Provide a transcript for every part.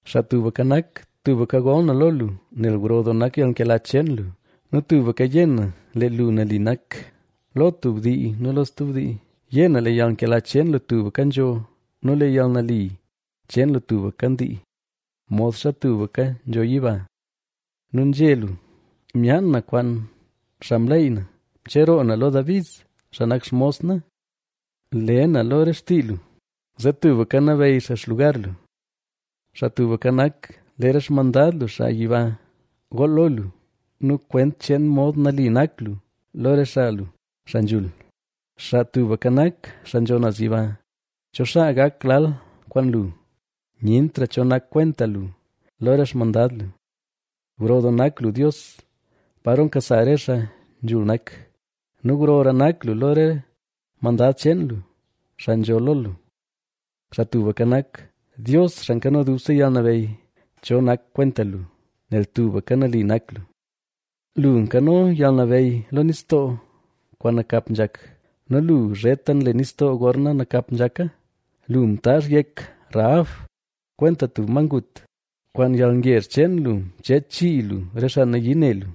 Xaa Tubka Nak, tubka gol na lo lu, nel gro doo nak yalnkela cheen lu nu tubka yé na, lee lu nali nak lo tub dii nu lo stub dii. Yé na lee yalnkela cheen lu tubka nzho nu lee yalnali cheen lu tubka ndii, modxa tubka nzho yiba. Nu nzhé lu: “Myaan na kwaan xaa mleyy na; mcheroo na lo David, xaa nak xmos na. Le na lo re xtii lu, zee tubka nabeyy xaa xlugar lu.” Xaa Tubka Nak, lee re xmandad lu xaa yiba gool lo lu nu kwent cheen mod nali nak lu lo re xaa lu, xaa nzhul. Xaa Tubka Nak, xaa nzho naz yiba, ¿Cho xaa gak lal kwaan lu? Nyentra cho nak kwenta lu, lo re xmandad lu. Gro doo nak lu Dios, paro nkasa re xaa nzhul nak nu grora nak lu lo re mandad cheen lu, xaa nzho lo lu. Xaa Tubka Nak, Dios, Xaa Nkano Dubse Yalnabeyy, ¿cho nak kwenta lu?, nel tubka nali nak lu. Lu nkano yalnabeyy lo nistoo kwaan nakap nzhak nu lu zheta nle nistoo gorna nakap nzhaka. Lu mtaazh yek Rahabb kwenta tub ma ngut, kwaan yalngezh cheen lu, mcheech chii lu re xaa nayii ne lu.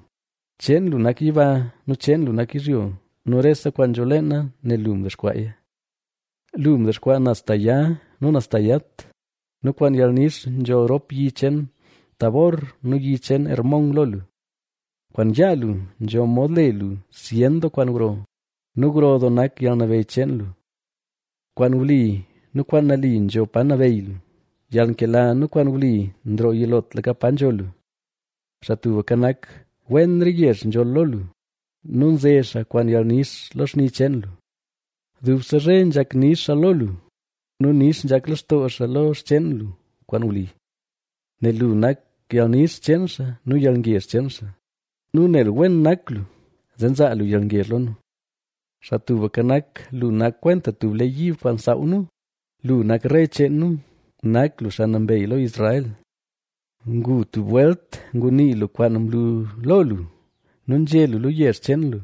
Cheen lu nak yiba nu cheen lu nak yizhyo nu rese kwaan nzho leena nel lu mdexkwaaya. Lu mdexkwaa naz ta ya nu naz ta yat nu kwaan yalnix nzholl rop yi cheen Tabor nu yi cheen Hermón lo lu. Kwaan yaa lu nzho mod le lu zyen doo kwaan gro nu gro doo nak yalnabeyy cheen lu. Kwaan wli nu kwaan nali nzho pa nabeyy lu; yalnkela nu kwaan wli nroo yilotlaka pa nzho lu. Xaa Tubka Nak, wen re yezh nzholl lo lu nu nze xaa kwaan yalnix lo xni cheen lu. Dubse zhe nzhak nix xaa lo lu, nu nix nzhak lextoo xaa lo xcheen lu kwaan wli. Nel lu nak yalnix cheen xaa nu yalngezh cheen xaa; nu nel wen nak lu, zee nzaa lu yalngezh lo nu. Xaa Tubka Nak, lu nak kwenta tub lee yiib kwaan nsaaw nu, lu nak rey cheen nu, nak lu xaa Nambey lo Israel. Ngu tub welt ngunii lu kwaan mlu lo lu nu nzhé lu lo yezh cheen lu,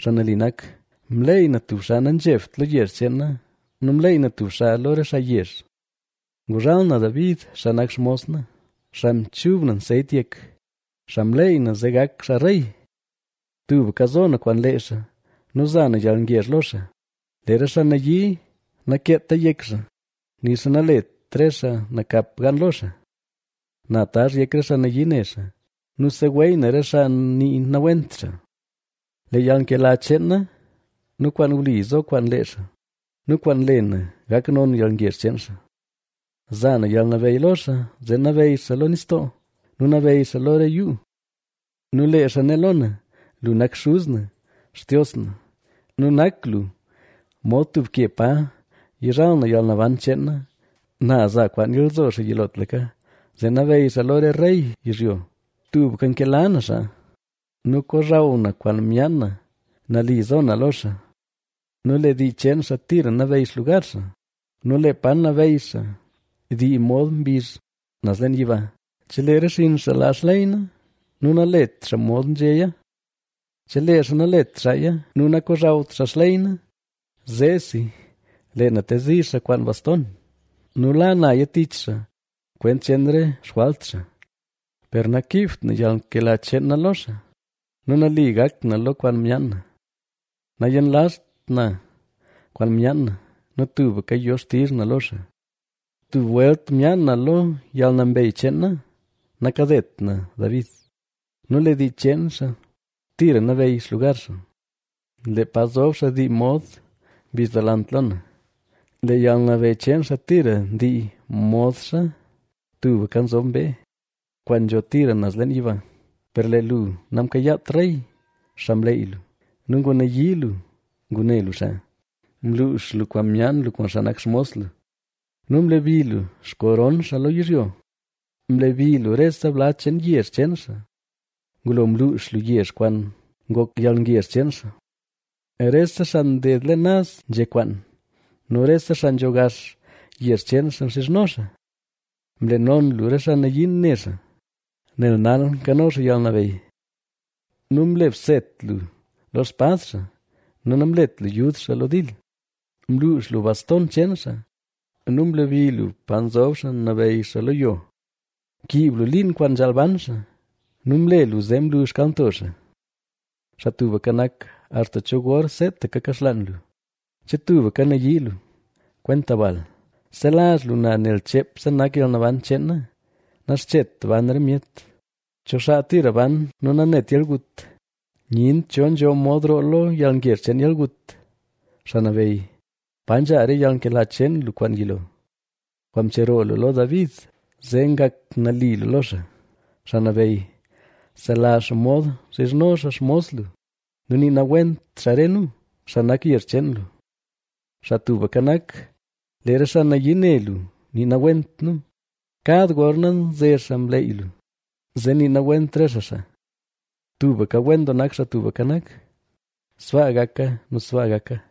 xaa nali nak: Mleey na tub xaa nanzhebt lo yezh cheen na nu mleey na tub xaa lo re xaa yezh. Nguzhal na David, xaa nak xmos na, xaa mchub na nseyt yek, xaa mleyy na, zee gak xaa rey. Tubka zo na kwaan lee xaa, nu za na yalngezh lo xaa. Lee re xaa nayii nakeeta yek xaa, nixa nalet re xaa nakap gan lo xaa. Na tazh yek re xaa nayii ne xaa, nu seweey na re xaa nii nawent xaa. Lee yalnkela cheen na nu kwaan wli zo kwaan lee xaa nu kwaan le na, gak non yalngezh cheen xaa. Za na yalnabeyy lo xaa, zee nabeyy xaa lo nistoo, nu nabeyy xaa lo re yuu. Nu lee xaa né lo na: “Lu nak xuz na, Xtios na, nu nak lu mod tub ke pa yizhal na yalnaban cheen na”. Na za kwaan nyalzo xaa yilotlaka, zee nabeyy xaa lo re rey yizhyo. Tubka nkela na xaa nu kozhaw na kwaan myaan na, nali zo na lo xaa. Nu lee dii cheen xaa tira nabeyy xlugar xaa nu lee pa nabeyy xaa, dii mod mbizh naz leen yiba. Chelee re xinn xaa laa xley na nu nalet xaa mod nzhéya, Chelee xaa nalet xaaya nu nakozhawt xaa xley na, zeesi lee na tezi xaa kwaan baston nu la naya tich xaa kwent cheen re xjwalt xaa. Per nakiibt yalnkela cheen na lo xaa nu nali gak na lo kwaan myaan na. Nayenlazht na kwaan myaan na nu tubka yo xtizh na lo xaa. Tub welt myaan na lo yalnambeyy cheen na, nakadet na David. Nu lee dii cheen xaa tira nabeyy xlugar xaa, lee pa zob xaa dii mod mbizh delant lo na. Lee yalnabeyy cheen xaa tira ndii modxa tubka nzob mbee, kwaan nzho tira naz leen yiba. Per lee lu namkayaat rey, xaa mleey lu nu ngunayii lu ngune lu xaa. Mluux lu kwaan myaan lu kwaan xaa nak xmos lu nu mlebi lu xkoron xaa lo yizhyo. Mlebi lu rese bla cheen yezh cheen xaa; ngulo mluux lu yezh kwaan ngok yalngezh cheen xaa. Rese xaa nded leen naz nzhe kwaan nu rese xaa nzho gax yezh cheen xaa nxizhno xaa. Mle non lu re xaa nayii ne xaa, nel nal nkano xaa yalnabeyy. Nu mle bset lu lo xspad xaa nu namlet lu yud xaa lo dil. Mluux lu baston cheen xaa nu mlebi lu pa nzob xaa nabeyy lo yo. Mkiib lu liin kwaan nzhaal ban xaa nu mle lu zee mlu xkalnto xaa. Xaa Tubka Nak, ¿Axta cho gor seetaka kaxlaan lu? ¿Che tubka nayii lu, kwenta bal? ¡Selazh lu na nel cheepse nak yalnaban cheen na! Naxchet ban re myet. ¿Cho xaa tira ban nu nanet yalgut? ¡Nyent cho nzho mod roo lo yalngezh cheen yalgut! Xaa Nabeyy, ¿Pa nzha re yalnkela cheen lu kwaan yilo, kwaan mcheroo lu lo David, zee ngak nali lu lo xaa? Xaa Nabeyy, selazh xomod nxizhno xaa xmos lu nu nii nawent xaa re nu, xaa nak yezh cheen lu. Xaa Tubka Nak, lee re xaa nayii ne lu nii nawent nu, kad gorna nze xaa mleey lu, zee nii nawent re xaa xaa. ¡Tubka wen doo nak Xaa Tubka Nak! ¡Sbaa gaka nu sbaa gaka!